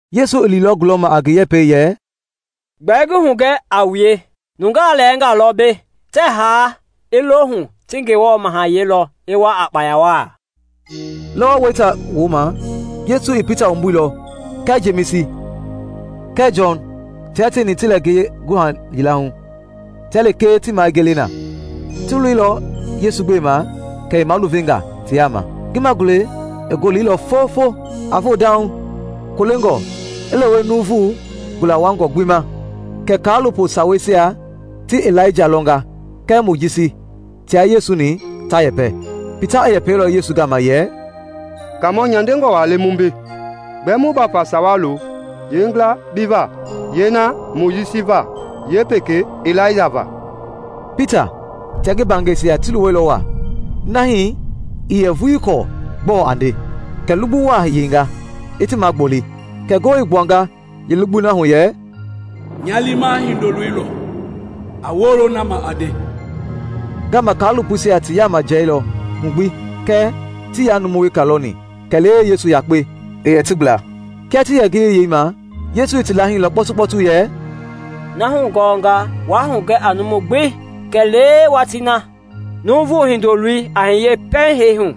Yesu i liilɔ gulɔma a ngi yɛpɛi yɛ, “Gbɛɛ ngi hugɛ a wue, nungaa lɛɛngaa lɔ mbei tɛɛ haa i lo hu ti Ngewɔ mahayɛi lɔ i wa a kpaya wa.” Lɔwɔ weita wooma Yesu i Pita wumbuilɔ, kɛɛ Jemisi kɛɛ Jɔn tia tieni ti lɛ ngiye guha yila hu, tia lekee ti ma i gele na. Ti loilɔ Yesu gbema kɛ i maluvenga ti yaama. Ngi magulɛi i goleilɔ fofo, a voo dauŋ, kolengɔ i lewe nuuvu gula wuangɔ gbi ma. Kɛ kaalopo saweisia ti Ilaija lɔnga kɛɛ Mojisi tia Yesu-ni ta yɛpɛ. Pita i yɛpɛilɔ Yesu gama yɛ, “Kaamɔ, nyandengɔ wa le mu mbei; gbɛɛ mu bafa sawa lo, yeengila bi va, yeena i Mojisi va, yeepekei i Ilaija va.” Pita tia ngi mbaangɛisia ti luwɛilɔ wa, na hii ii yɛ vuii kɔɔ gbɔɔ a nde. Kɛ lugbu wa i yeinga, i ti magboli, kɛ ngoo i gbuanga yeelugbui na hu yɛ, “Nya liima Hindoloi lɔ, a wolo na ma a nde.” Ngaama kaalopoisia ti yaama jiɛilɔ hu gbi kɛɛ tii yaa numu weka lɔni kɛlee Yesu yakpe i yɛ ti gbla. Kia ti yɛ ngiyei yeima Yesu i ti laahilɔ kpɔtukpɔtu yɛ, “Na wu hulɔnga waa hugɛ a numu gbi kɛlee watii na Nuuvu Hindoloi a hiye pɛiŋ hee hu.”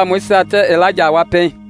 Kɛ ti Yesu mɔlinga tɛɛ, “Gbɛe Sawei Yeekaamɔisia tɛɛ Ilaija a wa pɛiŋ?”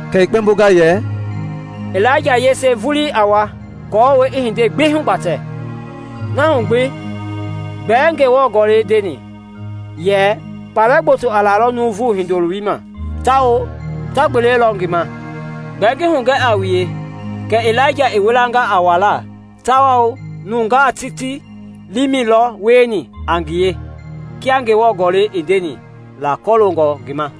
Kɛ i kpɛmbonga yɛ, “Ilaija yese vulii i wama aako i hindei gbi hugbatɛ. Na hu gbi gbɛe Ngewɔ Gɔlɛi ndeni yɛ kpalɛ gboto a lalɔ Nuuvu Hindoloi ma tawao ta gbelelɔ ngi ma? Gbɛɛ ngi hugɛ a wue kɛ Ilaija i wilanga a walaa tawao nungaa ti ti liimɛi lɔ wieni a ngie kia Ngewɔ Gɔlɛi i ndeni la kɔloongɔ ngi ma.”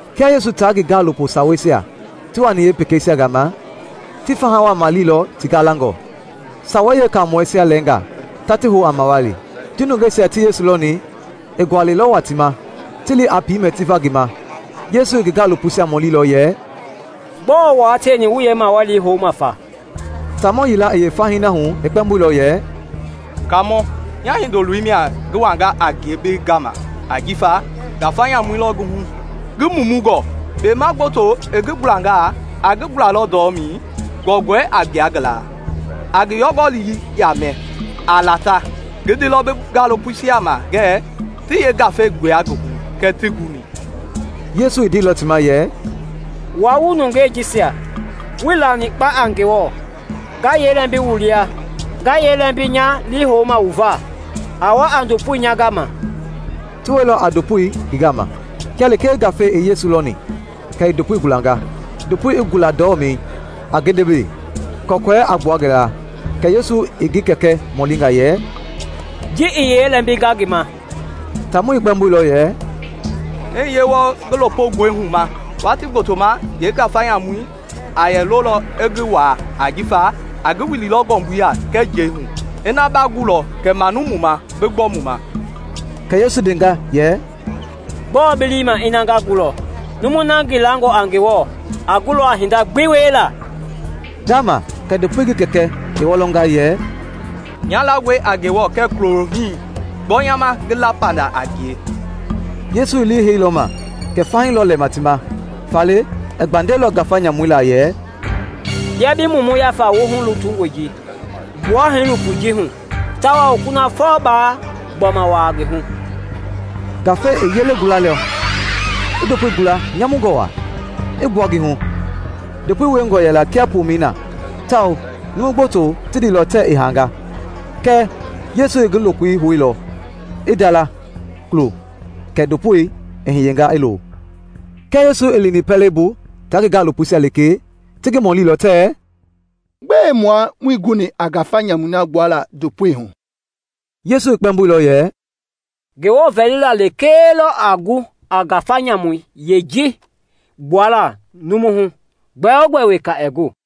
Kia Yesu taa ngi gaalopo saweisia ti wani yeepekeisia gama, ti faha wa maleilɔ ti galangɔ. Sawei Yeekaamɔisia lɛɛngaa ta ti hou a mawali. Ji nungeisia ti Yesu lɔni, i gualɛilɔ wa ti ma, ti li a piimɛ ti va ngi ma. Yesu i ngi gaalopoisia mɔlilɔ yɛ, “Gbɔɔ wua tieni wu yeemawalii houma fa?” Taamɔ yila i yeefahii na hu i kpɛmboilɔ yɛ, “Kaamɔ, Nya hindoloi mia ngi wanga a ngie bi gama ajifa ngafa nyamu lɔ ngi hu, ngi mumungɔ. Kpema gboto i ngi gulangaa, a ngi gulalɔ ndɔmɛi, kɔkɔɛi a gbua ngi la, a ngi yɔngɔlii yaamɛ, a lata. Ngi ndeilɔ bi gaalopoisia ma ngɛɛ ti yeengafei gbua ngi hu kɛɛ tii guni.” Yesu i ndeilɔ ti ma yɛ, “Wua wu nungei jisia, wuii lani kpa a Ngewɔ! Nga yee lɛmbi wu lia? Nga yee lɛmbi nya lii houma wu va? A wa a ndopoi nya gama.” Ti wɛilɔ a ndopoi ngi gama. Kia lekee ngafei i Yesu lɔni kɛ i ndopoi gulanga, ndopoi i gula ndɔmɛi, a gendebele, kɔkɔɛi a gbua ngi la. Kɛ Yesu i ngi kɛkɛ mɔlinga yɛ, “Ji i yee lɛmbinga ngi ma?” Taamɔi i kpɛmboilɔ yɛ, “I hiye wɔɔ ngi lopongɔihu ma. Watii gbotoma yeengafa nyamui a yɛ lolɔ i ngi waa ajifa a ngi wililɔ ngɔmbui ya kɛɛ njɛi hu. Ina ba gulɔ kɛ manu mu ma bi gbɔ mu ma.” Kɛ Yesu i ndenga yɛ, “Gbɔɔ bi lii i ma ina nga gulɔ? Numui na ngi langɔ a Ngewɔ a gulɔ a hinda gbi wiela.” Ngama kɛ ndopoi ngi kɛkɛ i wɔlɔnga yɛ, “Nya langɔe a Ngewɔ kɛɛ kulo hii. Gbɔ nya ma ngi la panda a ngie!” Yesu i lii heilɔ ma kɛ fahii lɔ lɛma ti ma, faale i gbandɛilɔ ngafa nyamui laa yɛ, “Bia bi mumu yafa woohu lutungɔi ji, gbua hiilopoi ji hu tawao kunafɔ baa gbɔma wua ngi hu!” Ngafei i yelei gulailɔ, i ndopoi gula nyamungɔ wa, i gbua ngi hu. Ndopoi wiengɔ yɛla kia pomɛi na tawao numu gboto ti ndeilɔ tɛɛ i haanga. Kɛɛ Yesu i ngi lokoi houilɔ i ndala kulo kɛ ndopoi i hiyenga, i lo. Kia Yesu i lini pɛlei bu taa ngi gaalopoisia lekee, ti ngi mɔlilɔ tɛɛ, “Gbɛe mua muii guni a ngafa nyamui na gbuala ndopoi hu?” Yesu i kpɛmboilɔ yɛ, “Ngewɔ vɛlila lekee lɔ a gu a ngafa nyamui yeeji gbuala numu hu; gbɛogbɛ weka ɛɛ gu.”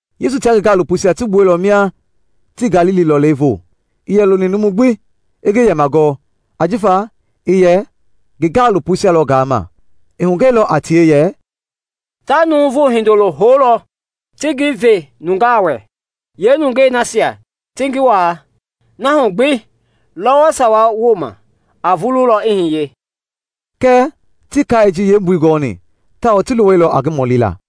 Yesu tia ngi gaalopoisia ti gbuɛilɔ mia ti Galili lɔlei voo. Ii yɛ loni numu gbi i ngi yɛma gɔɔ, ajifa i yɛ ngi gaalopoisia lɔ gaama; i hugɛilɔ a tie yɛ, “Ta Nuuvu Hindoloi houlɔ ti ngi ve nungaa wɛ, yeenungei nasia ti ngi wa. Na hu gbi, lɔwɔ sawa wooma, a vululɔ i hiye.” Kɛɛ tii kai ji yeembui gɔni tawao ti luwɛilɔ a ngi mɔlila.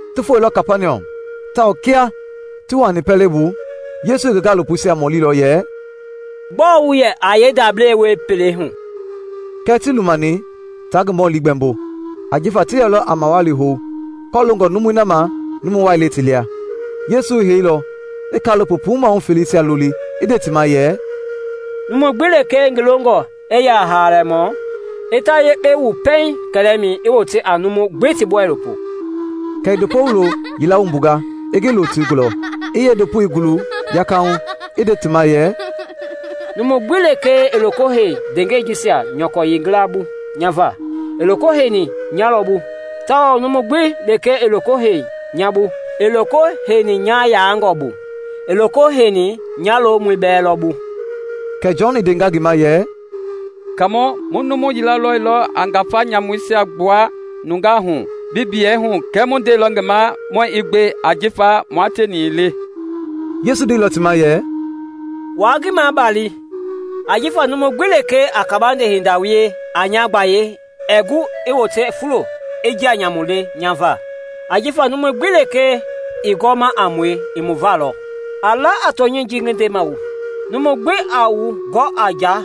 Ti foilɔ Kapaniɔm tawao kia ti wuani pɛlei bu Yesu i ngi gaalopoisia mɔlilɔ yɛ, “Gbɔɔ wu yɛ yeendablei wie pelei hu?” Kɛɛ tii lumani taa ngi mɔli gbɛmbo ajifa ti yɛlɔ a mawali hou kɔloongɔ numui na ma numu wai le ti lia. Yesu i heilɔ, i kaalopo puu maahu feleisia loli i nde ti ma yɛ, “Numu gbi lekee ngi longɔ i yɛ a haalamɔ, i ta yekpe wu pɛiŋ kɛlɛmɛi, i wote a numui gbi ti boilopo.” Kɛ i ndopo wulo yila wumbunga i ngi lo ti gulɔ. I yeendopoi guluilɔ yakahu i nde ti ma yɛ, “Numu gbi lekee a loko hei ndeengɛi jisia nyɔkɔ yeengila bu nya va, i loko heini nya lɔ bu; tawao numu gbi lekee a loko hei nya bu, ii loko heini nya yaangɔ bu, i loko heini nya lomɔi bɛɛ lɔ bu.” Kɛ Jɔn i ndenga ngi ma yɛ, “Kaamɔ, mu numu yila lɔilɔ a ngafa nyamuisia gbua nungaa hu bi biyei hu kɛɛ mu ndeilɔ ngi ma muɛɛ i gbe ajifa mua tieni ii le.” Yesu ndeilɔ ti ma yɛ, “Waa ngi mabali, ajifa numu gbi lekee a kabande hinda wie a nya gbayei ɛɛ gu i wote fulo i njia nyamu le nya va. Ajifa numu gbi lekee ii gɔma a mue i mu va lɔ. A la a tɔnyɛi ji ngi ndema, numu gbi a wu gɔ a nja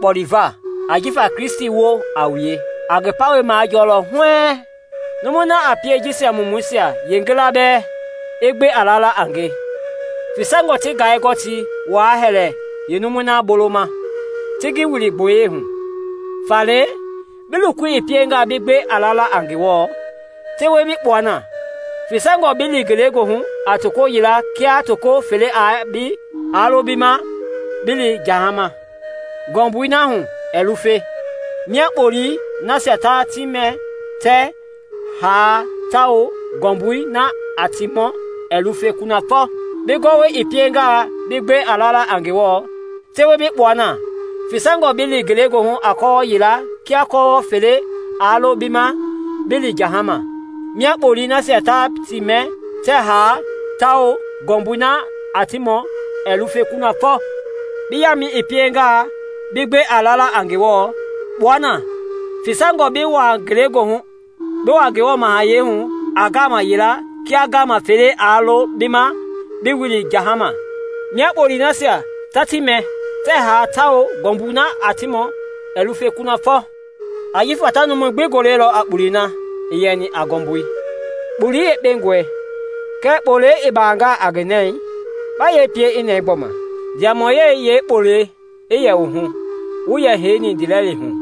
kpɔleva ajifa Kristi woo a wue, a ngi pawɛi majɔlɔ huɛɛŋ.” “Numui na a pie jisia mumuisia yeengila bɛɛ i gbe a lala a nge, fesangɔ ti ngai-gɔtii wa hɛlɛ yeenumui na boloma ti ngi wili gboyei hu. Faale bi lokoi piengaa bi gbe a lala a Ngewɔ, tewe bi kpua na! Fesangɔ bi li ngelegoohu a toko yila kia toko fele aa lo bi ma bi li jahama, ngɔmbui na hu ɛɛ lufe. [ Mia ‘kpolii nasia ta ti mɛ tɛɛ haa tawao ngɔmbui na a ti mɔ ɛɛ lufe kunafɔ.’] Bi gɔwɔi i piengaa bi gbe a lala a Ngewɔ, tewe bi kpua na! Fesangɔ bi li ngelegoohu a kɔwɔ yila kia kɔwɔ fele aa lo bi ma bi li jahama. [ Mia ‘kpolii nasia ta ti mɛ tɛɛ haa tawao ngɔmbui na a ti mɔ ɛɛ lufe kunafɔ.’] Bi yaamɛi piengaa bi gbe a lala a Ngewɔ, kpua na! Fesangɔ bi wua Ngewɔ mahayɛi hu a ngaama yila kia ngaama fele aa lo bi ma bi wili jahama, mia ‘kpolii nasia ta ti mɛ tɛɛ haa tawao ngɔmbui na a ti mɔ ɛɛ lufe kunafɔ.’ “Ajifa ta numui gbi golelɔ a kpolei na i yɛni a ngɔmbui. “Kpolei yekpengɔe; kɛɛ kpolei i bangaa a ngi nɛi, ba yee pie i nɛɛ gbɔma? Ndiamɔyɛi yeekpolei i yɛ wu hu, wu yɛ heini ndiilɛli hu.”